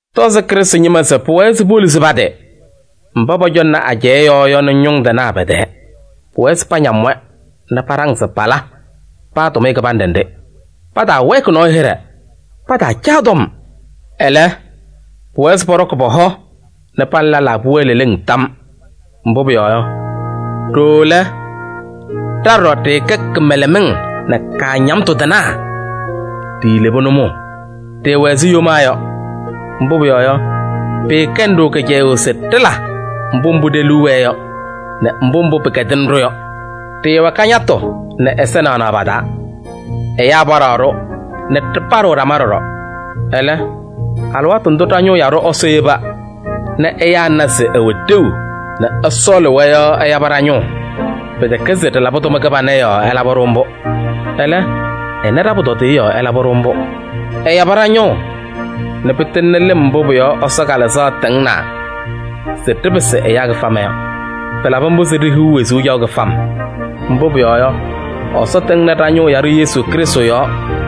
Tɔzɩ Krɩstʋ ñɩma se pʋwɛɛ se poluzi pa-tɩ mba pɔcɔŋnɩ ajɛɛ yɔɔ yɔ nɛ ñʋŋ tɩnaa pɛ-tɛɛ. Pʋwɛɛ se pañam-wɛ nɛ paɖaŋ se pala paa tʋmɩyɛ kɩbanɖɛ nɖɩ. Pataawɛɛkɩ nɔɔyʋ hɩɖɛ, pataacaa tɔm. Ɛlɛ, pʋwɛɛ se pɔɖɔkɩ pɔ-hɔ nɛ pa nɛ lɛlaa pʋwɛɛ leleŋ tam. Mbʋ pʋyɔɔ yɔ, ɖooo lɛ, ɖa ɖɔɖɔ ɖɩɩkɛ kɩmɛlɛmɩŋ nɛ kaañamtʋ tɩnaa, ɖiilebi nʋmɔʋ. Ɖɩɩwɛ ɛzɩ yomaa yɔ, mbʋ pʋyɔɔ yɔ, pɩɩkɛnɩ-ɖʋ kɩcɛyʋʋ se ɖɩla mbʋ mbʋ ɖe-liu wɛɛ yɔ nɛ mbʋ mbʋ pɩkɛdɩnɩ-ɖʋ yɔ. Ɖɩɩwɛ kañatʋ nɛ ɛza naɣnaɣ pa-taa. Ɛyaa paɖaɣ-ɖʋ nɛ ɖɩpaɖɩɣ ɖama ɖɔɖɔ. Ɛlɛ, alɩwaatʋ ndʋ ɖa-ñʋʋ yaɖʋ Ɛsɔ yeba nɛ ɛyaa na se ɛwɛ ɖeu nɛ ɛsɔɔlɩ-wɛ yɔ ɛyabɩ ɖa-ñʋʋ. Pɩtɛkɛ se ɖɩlabɩ tʋma kɩbana yɔɔ ɛlabɩ-ɖʋ mbʋ. Ɛlɛ, ɛna ɖa-pʋtɔdɩyɛ yɔɔ ɛlabɩ-ɖʋ mbʋ. Ɛyabɩ ɖa-ñʋʋ nɛ pɩtɩŋnɩ lɩm mbʋ pʋ-yɔɔ Ɛsɔ Kalɩzaɣ tɩŋnaa se ɖɩpɩsɩ ɛyaa kɩfama yɔ. Pɩlabɩ mbʋ se ɖihiɣ wezuu caɣʋ kɩfam. Mbʋ pʋyɔɔ yɔ, Ɛsɔ tɩŋnɩ ɖa-ñʋʋ yaɖʋ Yesu Krɩstʋ yɔɔ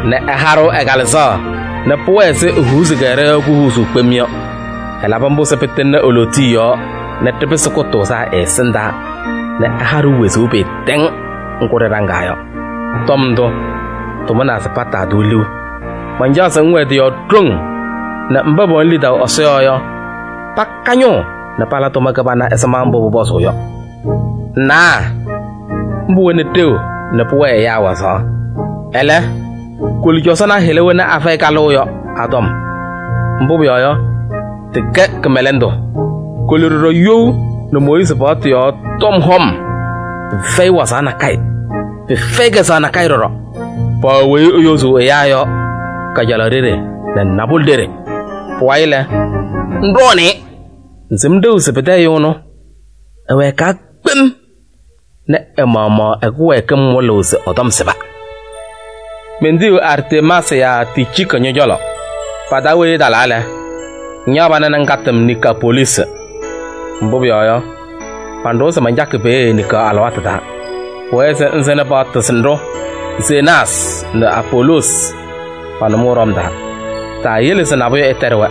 nɛ ɛha-ɖʋ ɛ-Kalɩzaɣ nɛ pʋwɛɛ ɛzɩ ehuuzi-kɛ ɖɔ-yɔɔ kuhuuzuu kpem yɔ. Ɛlabɩ mbʋ se pɩtɩŋnɩ e-lootiye yɔɔ nɛ ɖɩpɩsɩ kʋtʋʋzaa ɛ-ɛsɩndaa nɛ ɛha-ɖʋ wezuu pɩɩtɛŋ ŋgʋ ɖɩɖaŋaa yɔ. Tɔm ndʋ, tʋmʋnaa se pataa-tʋ liu. Mancaɣ se ŋwɛɛ tɩ-yɔɔ ɖoŋ nɛ mba pɛwɛnɩ lidaʋ Ɛsɔ yɔɔ yɔ, paka ñʋʋ nɛ pala tʋma kɩbana ɛzɩma mbʋ pʋpɔzʋʋ yɔ. Ŋnawa, mbʋ wɛnɩ ɖeu nɛ pʋwɛɛ ɛyaa wazaɣ. Ɛlɛ, koli cɔzɔnaa hɩla wena afɛyɩ kalʋʋ yɔ a-tɔm, mbʋ pʋyɔɔ yɔ, tɩkɛ kɩmɛlɛndʋ. Koli ɖɔɖɔ you nɛ Mooyiizi paɣtʋ yɔɔ tɔm hɔm. Pɩfɛyɩ wazaɣ nakɛyɛ, pɩfɛyɩ kɛzɛɣ ɖɔɖɔ. Paɣ weyi eyozuu ɛyaa yɔ kajalaɣ ɖeɖe nɛ nabʋlɛ ɖeɖe, pʋwayɩ lɛ ŋɖɔɔnɩ-ɩ. Ŋsɩm ɖeu se pɩtɛ ɛyʋ ɛnʋ ɛwɛɛkaa kpem nɛ ɛ-maɣmaɣ ɛ-kɩwɛɛkɩm wɩlɩɣ se ɛ-tɔm sɩba. Mentiyiɣ Artemaasɩ yaa Ticiiki ñɔ-cɔlɔ. Pa-taa weyi ɛtalaa lɛ, ŋñaɣ pana nɛ ŋkatɩ-m Niikopoliisi. Mbʋ pʋyɔɔ yɔ, manɖʋwa se mancakɩ peeye niŋkaɣ alɩwaatʋ taa. Pʋwɛɛ se ŋsɩnɩ paɣtʋ sɩnɖʋ Zenaasɩ nɛ Apoloosi pa-nʋmɔʋ ɖɔm taa. Taayele se nabʋyʋ ɛtɛɖɩ-wɛ.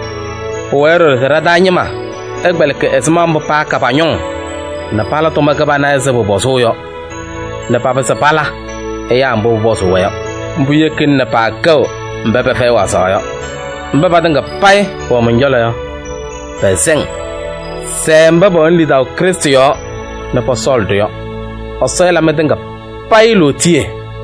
Pʋwɛɛ ɖɔɖɔ se ɖa-taa ñɩma ɛkpɛlɩkɩ ɛzɩma mbʋ paaka pa-ñʋŋ nɛ pala tʋma kɩbana ɛzɩ pʋpɔzʋʋ yɔ nɛ papɩzɩ pala ɛyaa mbʋ pʋpɔzʋʋ-wɛ yɔ. Mbʋ yekina nɛ paakɛɣ mba pɛfɛyɩ wazaɣ yɔ. Mba patɩŋa payɩ pɛwɛ mɔn-cɔlɔ yɔ, pɛsɛ-ŋ. Sɛɛ mba pɛwɛnɩ lidaʋ Krɩstʋ yɔɔ nɛ pɔsɔɔlɩ-ɖʋ yɔ. Ɛsɔ ɛla mɩtɩŋa payɩ lootiye.